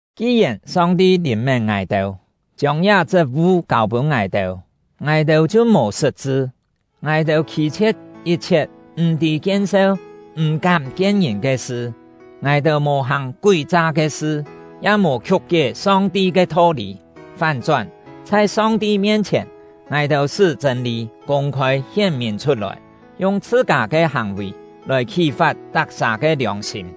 Ki-yèn Song-ti lìn-mén ngài-têu, chiông liá chṳt-vu kâu-pûn ngài-têu, ngài-têu chhiu mò sṳt-chṳ. Ngài-têu khî-chhie̍t yit-chhiet m̀-tî kien-seu m̀-kám kien ngìn ke sṳ; ngài-têu mò hàng kúi-cha ke sṳ, ya mò khiuk-kié Song-ti ke tho-lî. Fán-chón, chhai Song-ti mien-chhièn, ngài-têu sṳ́ chṳ̂n-lî kûng-khôi hién-mìn chhut-lòi, yung chhṳ-kâ ke hàng-vì lòi khí-fat tak-sà ke liòng-sîm.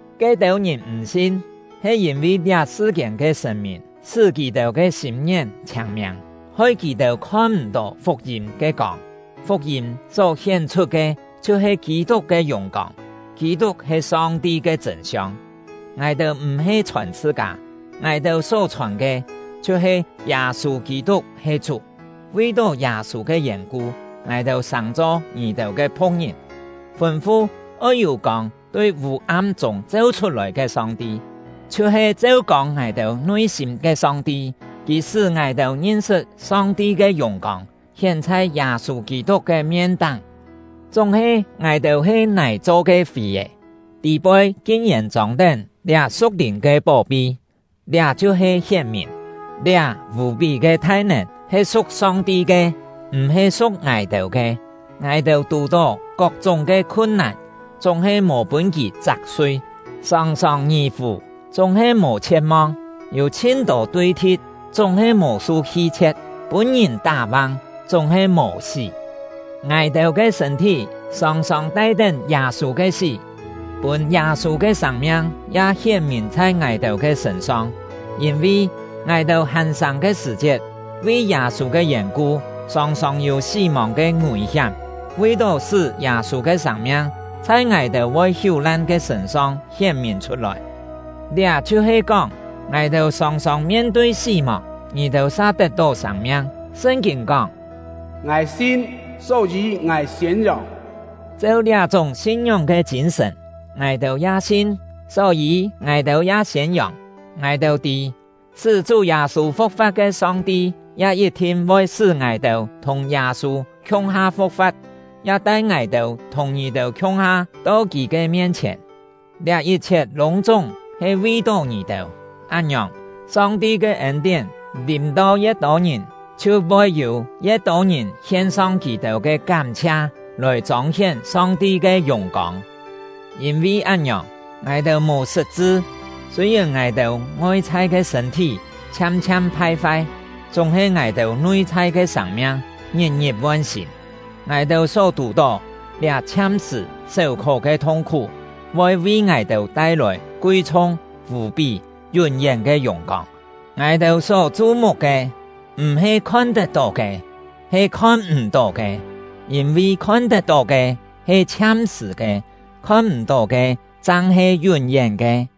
Ke-têu ngìn m̀ sin, he yîn-vi liá sṳ-kiên ke sṳ̀n-mìn sṳ́ kì-têu ke sîm-ngién chhiâng-miâng, hoi kì-têu khon-m̀-tó fuk-yîm ke kông; fuk-yîm só hién-chhut ke chhiu-he Kî-tuk ke yùng-kông, Kî-tuk he Song-ti ke chṳ̂n-siong. Ngài-têu m̀-he chhòn chhṳ-kâ, ngài-têu só chhòn ke chhiu-he “Yâ-sû Kî-tuk he Chú”; vi-tó Yâ-sû ke yèn-ku, ngài-têu sàng-cho ngì-têu ke phu̍k-ngìn. Fûn-fu “Oi yû kông tui vû-am chûng cheu-chhut-lòi” ke Song-ti, chhiu-he cheu-kông ngài-têu nui-sîm ke Song-ti; Kì sṳ́ ngài-têu ngin-sṳt Song-ti ke yùng-kông, hién chhai Yâ-sû Kî-tuk ke mien-táng. Chúng-he ngài-têu he nài cho ke fì-è, tî-poi kin-yèn chông-tén liá su̍k-lìn ke pó-pi; liá chhiu-he hién-mìn, liá vù-pí ke thai-nèn he su̍k Song-ti ke, m̀-he su̍k ngài-têu ke. Ngài-têu tù-tó kok-chúng ke khun-nàn, chúng-he mò pûn kì chak-sui; sòng-sòng ngì-fù, chúng-he mò chhie̍t-mong; yû chhin-tô tui-thi̍t, chúng-he mò su hi-chhie̍t; pûn-ngìn tá-vang, chúng-he mò sí. Ngài-têu ke sṳ̂n-thí sòng-sòng tai-tén Yâ-sû ke sí, pûn Yâ-sû ke sâng-miang ya hién-mìn chhai ngài-têu ke sṳ̂n-song. Yîn-vi, ngài-têu hàn sâng ke sṳ̀-chiet, vi Yâ-sû ke yèn-ku sòng-sòng yû sí-mòng ke ngùi-hiám, vi-tó sṳ́ Yâ-sû ke sâng-miang chhai ngài-têu voi hiú-lan ke sṳ̂n-song hién-mìn chhut-lòi. Liá chhiu-he kóng, ngài-têu sòng-sòng mien-tui sí-mòng, ngì-têu sa tet-tó sâng-miang. Sṳn-kîn kóng: “Ngài sin, só-yî ngài siên-yòng.” Cheu liá-chúng sin-ngióng ke chîn-sṳ̀n, ngài-têu ya sin, só-yî ngài-têu ya siên-yòng. Ngài-têu tî, sṳ́ Chú Yâ-sû fu̍k-fa̍t ke Song-ti ya yit-thin voi sṳ́ ngài-têu thùng Yâ-sû khiung-ha fu̍k-fa̍t, ya tai ngài-têu thùng ngì-têu khiung-ha to kì ke mien-chhièn. Liá yit-chhiet lûng-chúng he vi-tó ngì-têu; án-ngiòng, Song-ti ke ên-tién lìm-to ye̍t tô ngìn, chhiu voi yû ye̍t tô ngìn hien-song kì-têu ke kám-chhia lòi chông-hién Song-ti ke yùng-kông. Yîn-vi án-ngiòng, ngài-têu mò sṳt-chṳ. Sûi-yèn ngài-têu ngoi-chhai ke sṳ̂n-thí chhiam-chhiam phai-fai, chúng-he ngài-têu nui-chhai ke sâng-miang ngit-ngit von-sîn. Ngài-têu só tù-tó liá chhiam-sṳ̀ séu-khó ke thung-khú voi vi ngài-têu tai-lòi kui-chhung, vù-pí, yún-yén ke yùng-kông. Ngài-têu só chu-muk ke m̀-he khon-tet-tó ke, he khon-m̀-tó ke; yîn-vi khon-tet-tó ke he chhiam-sṳ̀ ke, khon-m̀-tó ke chang he yún-yén ke.